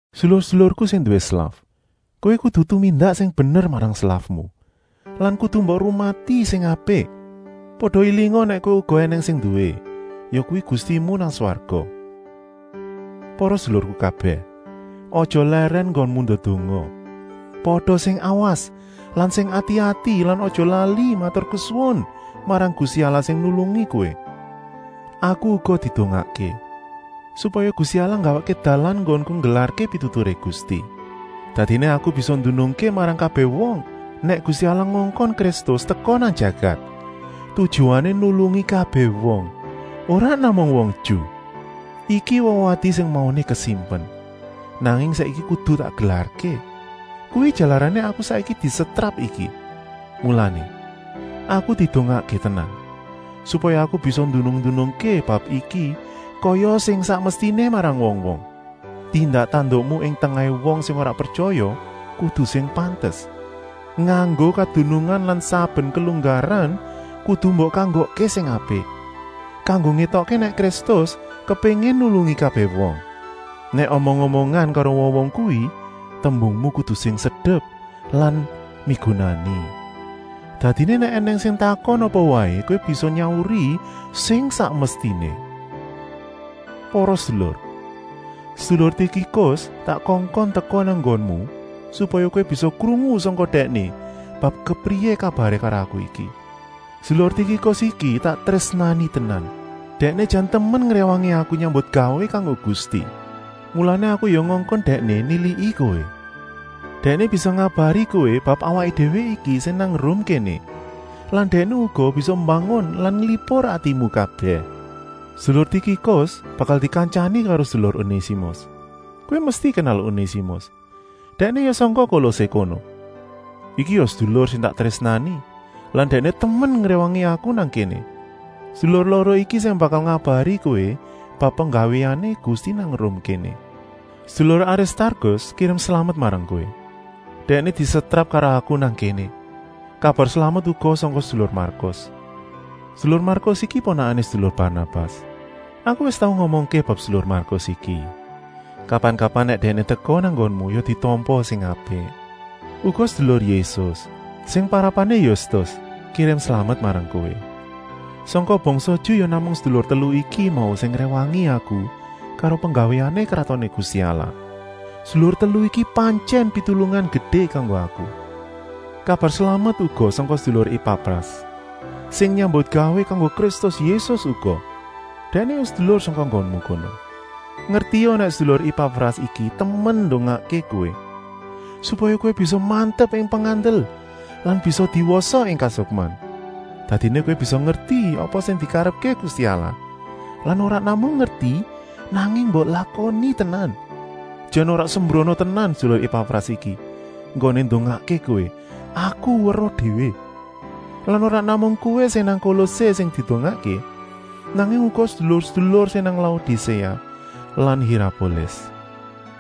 Sedulur-sedulurku sing nduwé slaf! Kowé kudu tumindak sing bener marang slafmu lan kudu mbok rumati sing apik. Pada élinga nèk kowé uga ènèng sing nduwé, yakuwi Gustimu nang swarga. Para sedulurku kabèh, aja lèrèn enggonmu ndedonga. Pada sing awas lan sing ati-ati lan aja lali maturkesuwun marang Gusti Allah sing nulungi kowé. Aku uga didongakké, supaya Gusti Allah nggawèkké dalan enggonku nggelarké pituturé Gusti. Dadiné aku bisa ndunungké marang kabèh wong nèk Gusti Allah ngongkon Kristus teka nang jagat, tujuané nulungi kabèh wong, ora namung wong Ju. Iki wewadi sing mauné kasimpen, nanging saiki kudu tak gelarké. Kuwi jalarané aku saiki disetrap iki. Mulané, aku didongakké tenan, supaya aku bisa ndunung-ndunungké bab iki kaya sing sak mestiné marang wong-wong. Tindak-tandukmu ing tengahé wong sing ora pretyaya kudu sing pantes, nganggo kadunungan lan saben kelunggaran kudu mbok kanggokké sing apik, kanggo ngétokké nèk Kristus kepéngin nulungi kabèh wong. Nèk omong-omongan karo wong-wong kuwi tembungmu kudu sing sedep lan migunani. Dadiné nèk ènèng sing takon apa waé kowé bisa nyauri sing sak mestiné. Para sedulur, sedulur Tikikus tak kongkon teka nang nggonmu, supaya kowé bisa krungu sangka dèkné bab kepriyé kabaré karo aku iki. Sedulur Tikikus iki tak trésnani tenan, dèkné jan temen ngréwangi aku nyambutgawé kanggo Gusti. Mulané aku ya ngongkon dèkné niliki kowé. Dèkné bisa ngabari kowé bab awaké déwé iki sing nang Rum kéné lan dèkné uga bisa mbangun lan nglipur atimu kabèh. Sedulur Tikikus bakal dikantyani karo sedulur Onésimus. Kowé mesti kenal Onésimus, dèkné ya sangka Kolosé kono. Iki ya sedulur sing tak trésnani lan dèkné temen ngréwangi aku nang kéné. Sedulur loro iki sing bakal ngabari kowé bab penggawéané Gusti nang Rum kéné. Sedulur Aristarkus kirim slamet marang kowé. Dèkné disetrap karo aku nang kéné. Kabar slamet uga sangka sedulur Markus. Sedulur Markus iki ponakané sedulur Barnabas. Aku wis tau ngomongké bab sedulur Markus iki. Kapan-kapan nèk dèkné teka nang nggonmu ya ditampa sing apik. Uga sedulur Yésus, sing parapané Yustus, kirim slamet marang kowé. Sangka bangsa Ju ya namung sedulur telu iku mau sing ngréwangi aku karo penggawéané kratoné Gusti Allah. Sedulur telu iki pantyèn pitulungan gedé kanggo aku. Kabar slamet uga sangka sedulur Epafras, sing nyambutgawé kanggo Kristus Yésus uga. Dèkné ya sedulur sangka nggonmu kono. Ngertia nèk sedulur Epafras iki temen ndongakké kowé, supaya kowé bisa mantep ing pengandel lan bisa diwasa ing kasukman. Dadiné kowé bisa ngerti apa sing dikarepké Gusti Allah lan ora namung ngerti, nanging mbok lakoni tenan. Jan ora sembrana tenan sedulur Epafras iki enggoné ndongakké kowé, aku weruh déwé. Lan ora namung kowé sing nang Kolosé sing didongakké, nanging uga sedulur-sedulur sing nang Laodiséa lan Hirapolis.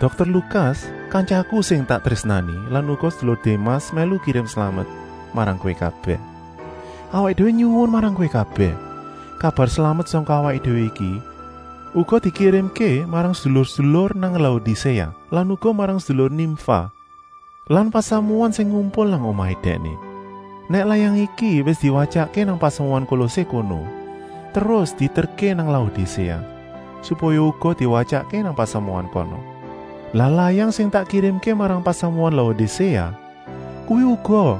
Dokter Lukas, kantyaku sing tak trésnani lan uga sedulur Démas mèlu kirim slamet marang kowé kabèh. Awaké déwé nyuwun marang kowé kabèh, kabar slamet sangka awaké déwé iki uga dikirimké marang sedulur-sedulur nang Laodiséa lan uga marang sedulur Nimfa lan pasamuan sing ngumpul nang omahé dèkné. Nèk layang iki wis diwatyakké nang pasamuan Kolosé kono, terus dieterké nang Laodiséa, supaya uga diwatyakké nang pasamuan kana. Lah layang sing tak kirimké marang pasamuan Laodiséa, kuwi uga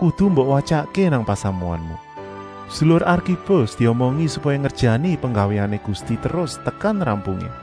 kudu mbok watyaké nang pasamuanmu. Sedulur Arkipus diomongi supaya ngerjani penggawéané Gusti terus tekan rampungé.